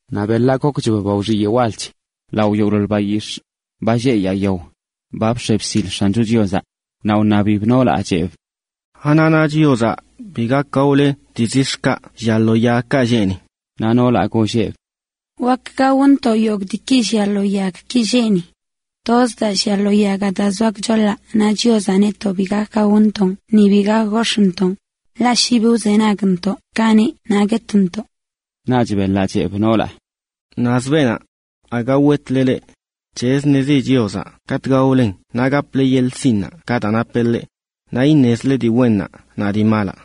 Naꞌ beḻaꞌ gokchb ba wxiyeꞌ walch lao yogꞌḻoḻ bayix̱ꞌ, ba lleꞌ yaa yao, ba bx̱e bsil X̱ancho Chiozaꞌ. Naꞌ wṉabib noolaꞌ, cheꞌb: ―¿Anaꞌ na Chiozaꞌ bi gak gaole dii zix̱ki llia lo yagki lleꞌ ni? Naꞌ noolaꞌ golleꞌb: ―Wak gaontoꞌ yogꞌ diiki llia lo yagki lleꞌ ni. Toz daa llia lo yagaꞌ daa zoa gchoḻaꞌ na Chiozaꞌ netoꞌ bi gak gaontoꞌn ni bi gak gox̱ꞌntoꞌn, ḻaꞌ shi bi wzenagntoꞌ ka neꞌ naꞌ guetntoꞌ. Naꞌch beḻaꞌ cheꞌb noolaꞌ: ―Naz beenaꞌ. Aga wetle leꞌ. C̱hezə daa ṉezi Chiozaꞌ katꞌ ba wdaolennanꞌ naꞌ gaple yeḻꞌ sinꞌ ka daa napeꞌ ḻeꞌ, naꞌ iṉezile dii wennaꞌ naꞌ dii malaꞌ.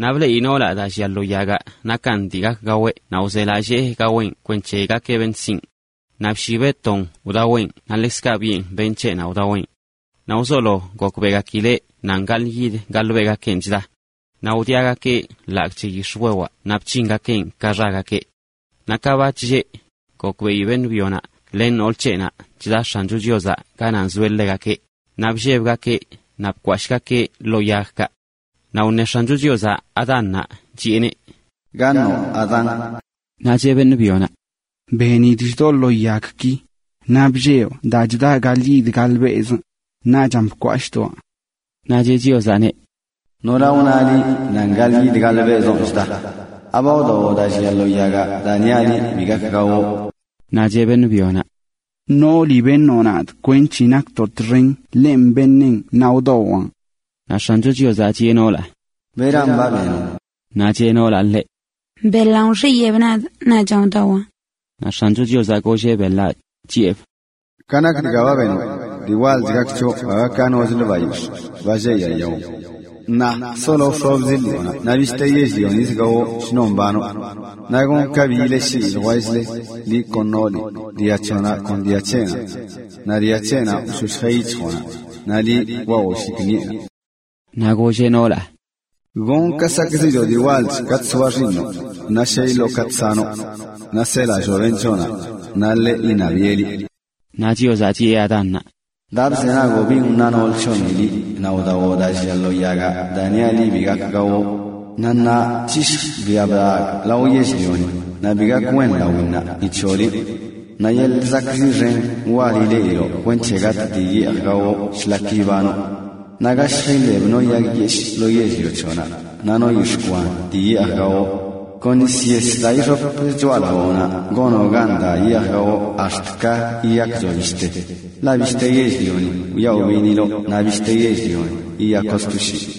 Naꞌ bleꞌi noolaꞌ daa llia lo yagaꞌ nakan dii gak gaweꞌ naꞌ wzelallee gaweꞌn kwenc̱he gakeꞌ beṉꞌ sinꞌ. Naꞌ bshibeꞌ ton wdaweꞌn naꞌ ḻekzkaꞌ biꞌen beṉꞌ c̱heꞌnaꞌ wdaweꞌn. Naꞌ wzolo gokbeꞌgakileꞌ nan gaḻꞌyid gaḻꞌbelꞌgakenꞌ chda. Naꞌ wdiagakeꞌ ḻagꞌ c̱he yix̱wewaꞌ naꞌ bc̱hingakeꞌn ka xagakeꞌ. Naꞌ ka ba chlleꞌ, gokbeꞌi beṉꞌ byonaꞌ len nool c̱heꞌnaꞌ chda X̱ancho Chiozaꞌ ganaꞌ nzoeꞌ ḻegakeꞌ, naꞌ bllebgakeꞌ naꞌ bkwashꞌgakeꞌ ḻoo yagkaꞌ. Naꞌ wṉe X̱ancho Chiozaꞌ Adánnaꞌ, chiꞌeneꞌ: ―¿Gaṉoꞌ, Adán? Naꞌ cheꞌ beṉꞌ byonaꞌ: ―Benidꞌ chdoꞌ ḻoo yagki, naꞌ bllebꞌ daa chdaꞌ gaḻꞌyid gaḻꞌbelꞌzꞌ, naachan bkwashꞌdoaꞌ. Naꞌ cheꞌ Chiozaꞌneꞌ: ―¿Nora wna liꞌ nan gaḻꞌyid gaḻꞌbelꞌzonꞌ chda? ¿Aba wdawoꞌ daa llia lo yagaꞌ daa niaꞌ liꞌ bi gak gawoꞌ? Naꞌ cheꞌ beṉꞌ byonaꞌ: ―Nooli beṉoꞌ nadꞌ kwenc̱he nakntoꞌ txen ḻenꞌ beṉeꞌn naꞌ wdawaꞌn. Naꞌ X̱ancho Chiozaꞌ chiꞌe noolaꞌ: ―¿Beran ba benoꞌ? Naꞌ cheꞌ noolaꞌ ḻeꞌ: ―Beḻanꞌ wxiyeeb nadꞌ naꞌchan wdawaꞌn. Naꞌ X̱ancho Chiozaꞌ golleꞌ beḻaꞌ: ―Ka nak dga ba benoꞌ, dii walchlə gak c̱hoꞌ aga ka nochlə bayix̱ꞌ, ba lleꞌ yaa yao. Ṉaa solo wxobzi ḻiꞌonaꞌ naꞌ bishte yell-lionizə gawoꞌ shnon mbanoꞌ. Naꞌ gonꞌ ka bi ileꞌshii ljwell-le, liꞌ kon nooli, dia c̱hoꞌnaꞌ kon dia c̱heꞌnaꞌ. Naꞌ dia c̱heꞌnaꞌ wshoshjeꞌ yic̱hjoꞌnaꞌ, naꞌ liꞌ kwawoo shikṉiꞌenaꞌ(). Naꞌ golleꞌ noolaꞌ: ―Gonꞌ ka sakꞌziꞌchoꞌ dii walch katꞌ soa xiiṉoꞌ, naꞌ shey iloꞌ katꞌ sanoꞌ. Naꞌ selalloo beṉꞌ c̱hoꞌnaꞌ, naꞌ ḻeꞌ iṉabiꞌe liꞌ. Naꞌ Chiozaꞌ chiꞌe Adánnaꞌ: ―Daa bzenagoꞌ bin wna nool c̱hoꞌni naꞌ wdawoꞌ daa llia lo yagaꞌ daa niaꞌ liꞌ bi gak gawoꞌ, naꞌ ṉaa c̱hishjꞌ biaꞌ blagꞌ lao yell-lioni, naꞌ bi gak wen lawinnaꞌ ni c̱hoꞌ liꞌ. Naꞌ yeḻꞌ zakꞌziꞌ xen wal ileꞌiloꞌ kwenc̱he gatꞌ dii yeej gawoꞌ shlak ibanoꞌ. Naꞌ gashj iḻeb no yag yeshꞌ lo yell-lio c̱hoꞌnaꞌ, naꞌ no yix̱ꞌ kwanzə yeej gawoꞌ. Kon nis yes daa ixop choꞌalawoꞌnaꞌ gonoꞌ gan daa yeej gawoꞌ ax̱t ka yiyakchoꞌ bishte, ḻaꞌ bishte yell-lioni wyaꞌ wbiṉiloꞌ naꞌ bishte yell-lio yiyakoꞌ sto shii.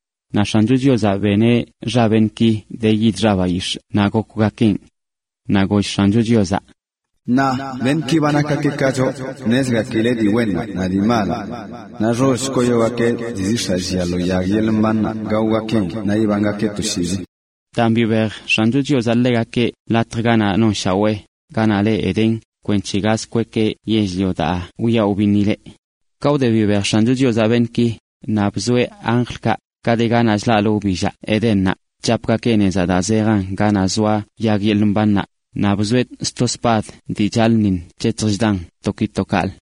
Naꞌ X̱ancho Chiozaꞌ beneꞌ xa beṉꞌki de yid xa bayix̱ꞌ naꞌ gokwgakeꞌn. Naꞌ goll X̱ancho Chiozaꞌ: “Ṉaa beṉꞌki ba nakgakeꞌ ka choꞌ, ṉezgakileꞌ dii wennaꞌ naꞌ dii malaꞌ. Naꞌ xoll koyogakeꞌ dii zix̱aꞌ llia lo yag yeḻꞌ mbannaꞌ gaogakeꞌn naꞌ ibangakeꞌ toshiizi.” Daan bibej X̱ancho Chiozaꞌ ḻegakeꞌ latj ganaꞌ nonshawee, ganaꞌ le Edén, kwenc̱he gaz kwekeꞌ lo yell-lio daa wyaꞌ wbiṉileꞌ. Ka wde bibej X̱ancho Chiozaꞌ beṉꞌki, naꞌ bzoeꞌ anjlkaꞌ, ka de ganaꞌ chlaꞌlə wbillaꞌ Edénnaꞌ, chapgakeꞌ nezaꞌ daa zejan ganaꞌ zoa yag yeḻꞌ mbannaꞌ, naꞌ bzoeꞌ sto spad dii chaḻꞌṉiṉ chec̱hjan to ki to kaꞌlə.